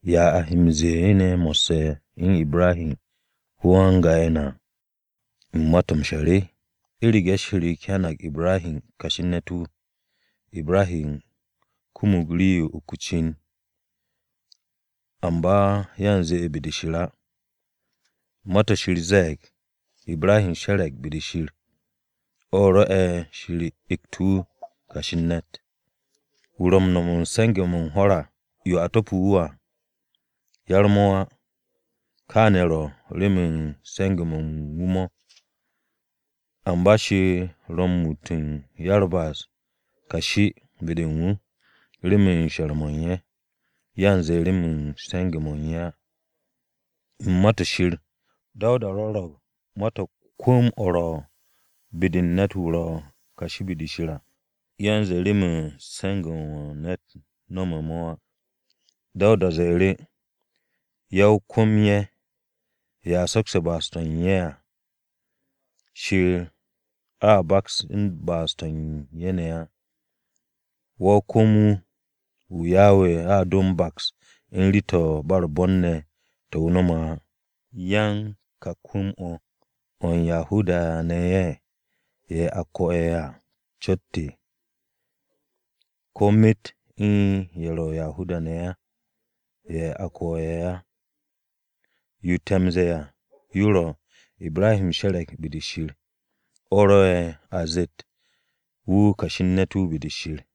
¿Ya a he m-ze̱e̱ ne̱ mo̱sse̱ u̱n Ibrahi ne̱, ko-yan-ga'e̱ na, u̱n ma-to̱ m-she̱r? U̱rege̱ Shir hyanag Ibrahi kashi u̱n ne̱t-wu̱, Ibrahi kumug rii-yo u̱n uk o-cin, amba yanze be-de Shir á. Ma-to̱ Shir ze̱e̱g, “Ibrahi she̱re̱g be-de Shir, o̱ rwo̱'e̱ Shir egt wu̱ kashi u̱n ne̱t.” Wu̱ ro̱ u̱n no̱m u̱n se̱nge̱-mo̱ u̱n hwo̱r-ye̱ a to̱pe̱ wu̱ à, yar-mo̱ á. Kaane̱ ro̱ remen se̱nge̱-mo̱ u̱n wu̱ mo̱. Amba Shir ro̱ muut u̱n ya-u̱r-ba'as kashi be-de u̱n wu̱ remen she̱r-mo̱ u̱n ye̱, yanze remen se̱nge̱-mo̱ u̱n ye̱ á. U̱n Ma-to̱ Shir, Dawuda rwo̱ro̱g ma-to̱ u̱n kwu̱m-o̱ ro̱ be-de u̱n ne̱t-wu̱ ro̱ kashi be-de Shir à, yanze remen se̱nge̱-mo̱ ne̱t no̱me̱ mo̱ á. Dawuda ze̱e̱ru̱: “Ya-o-kwu̱m-ye̱, ye̱ a sokse̱ ba'as-to̱ u̱n ye̱ à, Shir a baks u̱n ba'as-to̱ u̱n ye̱ ne̱ á. Wa-o-kwu̱m-wu̱, wu̱ Yawe a do m-baks u̱n rii-to̱ u̱n ba u̱r-bon ne̱, to̱ wu̱ no̱me̱ á.” ¿Yan ka kwu̱m-o̱, o̱ u̱n Yahuda-ne̱ o̱, ye̱ a ko̱e̱ à cot? ¿Ko̱ myet u̱n ye̱ ro̱ Yahuda-ne̱ á, ye̱ a ko̱e̱ á? Yo te̱ m-ze̱e̱ à, yo ro̱, “Ibrahi she̱re̱g be-de Shir,” o̱ rwo̱'e̱ a zett “wu̱ kashi u̱n ne̱t be-de Shir.”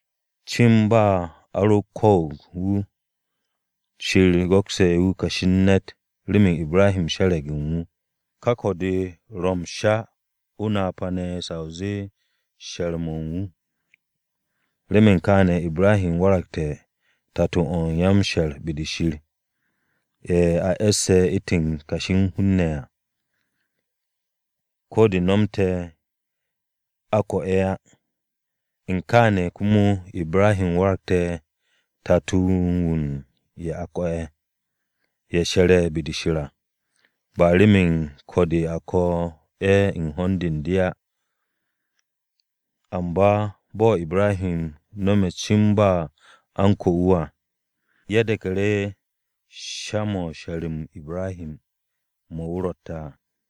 Cin ba a ro ko̱o̱g wu̱, Shir go̱ste̱ wu̱ kashi u̱n ne̱t remen Ibrahi she̱re̱g u̱n wu̱. Ka ko̱-de ro m-sha, o-napa ne̱ sa o zee she̱r-mo̱ u̱n wu̱. Remen kaane̱, Ibrahi waragte̱ tato-o̱ ya-m-she̱r be-de Shir, ye̱ a e̱sse̱ u̱ntu̱n kashi u̱n hun-ne̱ à, ko̱ de nomte̱ à a ko̱ ye̱ á. U̱n kaane̱, komo Ibrahi waragte̱ tato-o̱ u̱n ye̱ a ko̱e̱, ye̱ she̱re̱ be-de Shir à. Ba remen ko̱-de a ko̱ ye̱ u̱n hond u̱n de á. Amba bo̱ Ibrahi no̱me̱ cin ba a u̱n ko̱ wu̱ à, ye̱ de̱ku̱ru̱ sha-mo̱ u̱n she̱r-m Ibrahi mo̱ wu̱ rotte̱ à.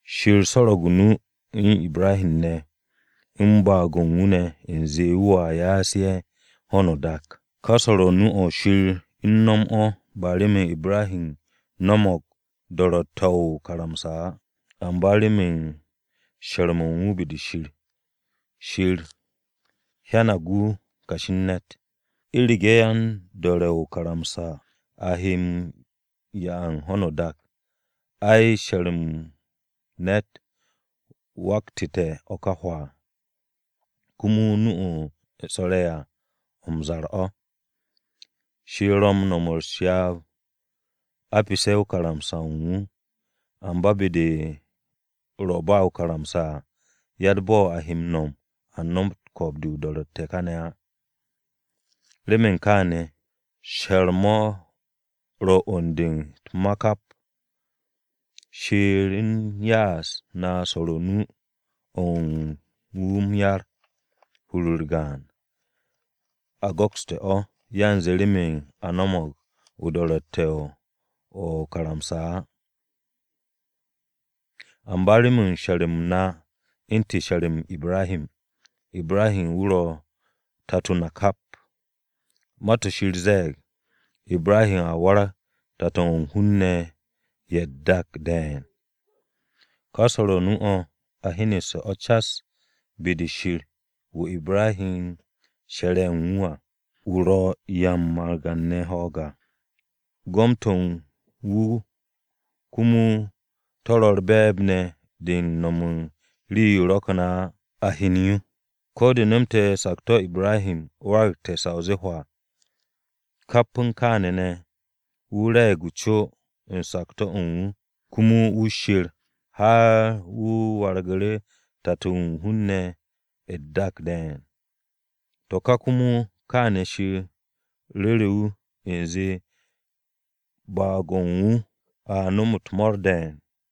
Shir swo̱ro̱g o-nu u̱n Ibrahi ne̱ u̱n baag-o̱ u̱n wu̱ ne̱ u̱nze wu̱a ya'as ye̱ ho̱no o-dak. Ka swo̱o̱ru̱ nu-o̱ Shir u̱n no̱m o̱ ba remen Ibrahi no̱mo̱g o-do̱ro̱tte̱ o̱ o-karamsa á, amba remen she̱r-mo̱ u̱n wu̱ be-de Shir. Shir hyanag wu̱ kashi u̱n ne̱t. U̱rege̱ yan-do̱re̱ o-karamsa ye̱ a he m-'ya u̱n ho̱no o-dak, ai she̱r-mo̱ u̱n ne̱t waktu̱te̱ o̱ ka hwaa, komo nu-o̱ Shir swo̱re̱ à o̱ m-zar o̱. Shir ro̱ u̱n no̱m u̱s-ryaab a pesse̱ karamsa-o̱ u̱n wu̱. Amba be-de ro̱ ba o-karamsa à, yatt bo̱ a he m-no̱m a nomot ko̱o̱b-de o-do̱ro̱tte̱ kane̱ á. Remen kaane̱, she̱r-mo̱ ro̱ 'wu̱n-de u̱t-ma kap. Shir u̱n ya'as na swo̱r o-nu o̱ u̱n wu̱ m-yar, hur-u̱r gaan. A go̱kste̱ o̱, yanze remen a no̱mo̱g o-do̱ro̱tte̱ o̱ o-karamsa á, amba remen she̱r-m na u̱ntu̱n she̱r-m Ibrahi. Ibrahi wu̱ ro̱ tato na kap. Ma-to̱ Shir ze̱e̱g, “Ibrahi a warag tato-o̱ u̱n hun-ne̱ ye̱ u̱t-dak de̱e̱n.” Ka swo̱o̱ru̱ nu-o̱ a hyenu̱ste̱ o̱ cas be-de Shir wu̱ Ibrahi she̱re̱ u̱n wu̱ à. Wu̱ ro̱ u̱n 'ya u̱n margan-ne̱ ho̱o̱g à, gom-to̱ u̱n wu̱ komo to̱ ro̱ u̱r-be̱e̱b ne̱ de u̱n no̱m u̱n rii-yo ro̱kne̱ á, a hyen yo. Ko̱ de nomte̱ sakto̱-o Ibrahi waragte̱ sa o zee hwaa, kap u̱n kaane̱ ne̱ wu̱ re̱e̱g co u̱n sakto̱-o u̱n wu̱, komo wu̱ sher har wu̱ wargu̱ru̱ tato-o̱ u̱n hun-ne̱ ye̱ u̱t-dak de̱e̱n. To̱ ka komo kaane̱ Shir ru̱ru̱ wu̱, u̱nze, “Baag-o ru a nom u̱t-mo̱o̱r de̱e̱n.”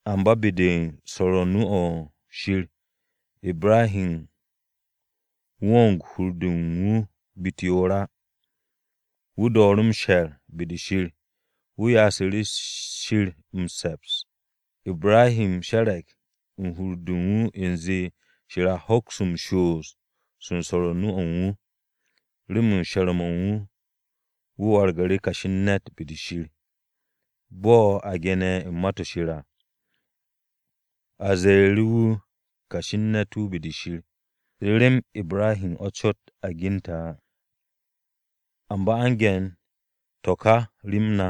Amba be-de u̱n swo̱r o-nu o̱ Shir, Ibrahi wong hur-de u̱n wu̱ be-u̱t yoor á. Wu̱ dooru̱ m-she̱r be-de Shir, wu̱ ya'asu̱ru̱ Shir m-se̱ps. Ibrahi she̱re̱g u̱n hur-de u̱n wu̱, u̱nze, Shir a hoks m-shoos u̱n swo̱o̱ru̱ nu-o̱ u̱n wu̱. Remen she̱r-mo̱ u̱n wu̱, wu̱ wargu̱ru̱ kashi u̱n ne̱t be-de Shir. Bo̱ a ge̱ne̱ u̱n Ma-to̱ Shir à, “A ze̱e̱ru̱ wu̱ kashi u̱n ne̱t be-de Shir.” Rem Ibrahi o̱ cot a gente̱ á. Amba a u̱n ge̱n to̱ ka rem na,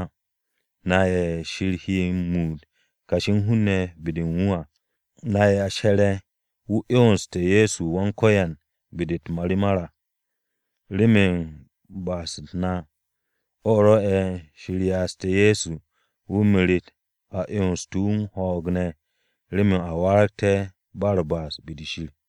na ye̱ Shir he m-muut kashi u̱n hun-ne̱ be-de u̱n wu̱ à, na ye̱ she̱re̱ u̱n wu̱ 'yonse̱ Ye̱so Wan-Ko̱yan be-de u̱t-marimar à. Remen ba'as-u̱t na o̱ rwo̱'e̱ Shir ya'aste̱ Ye̱so wu̱ meret a 'yons wu̱ u̱n ho̱o̱g ne̱ remen a waragté̱ ba u̱r-ba'as be-de Shir.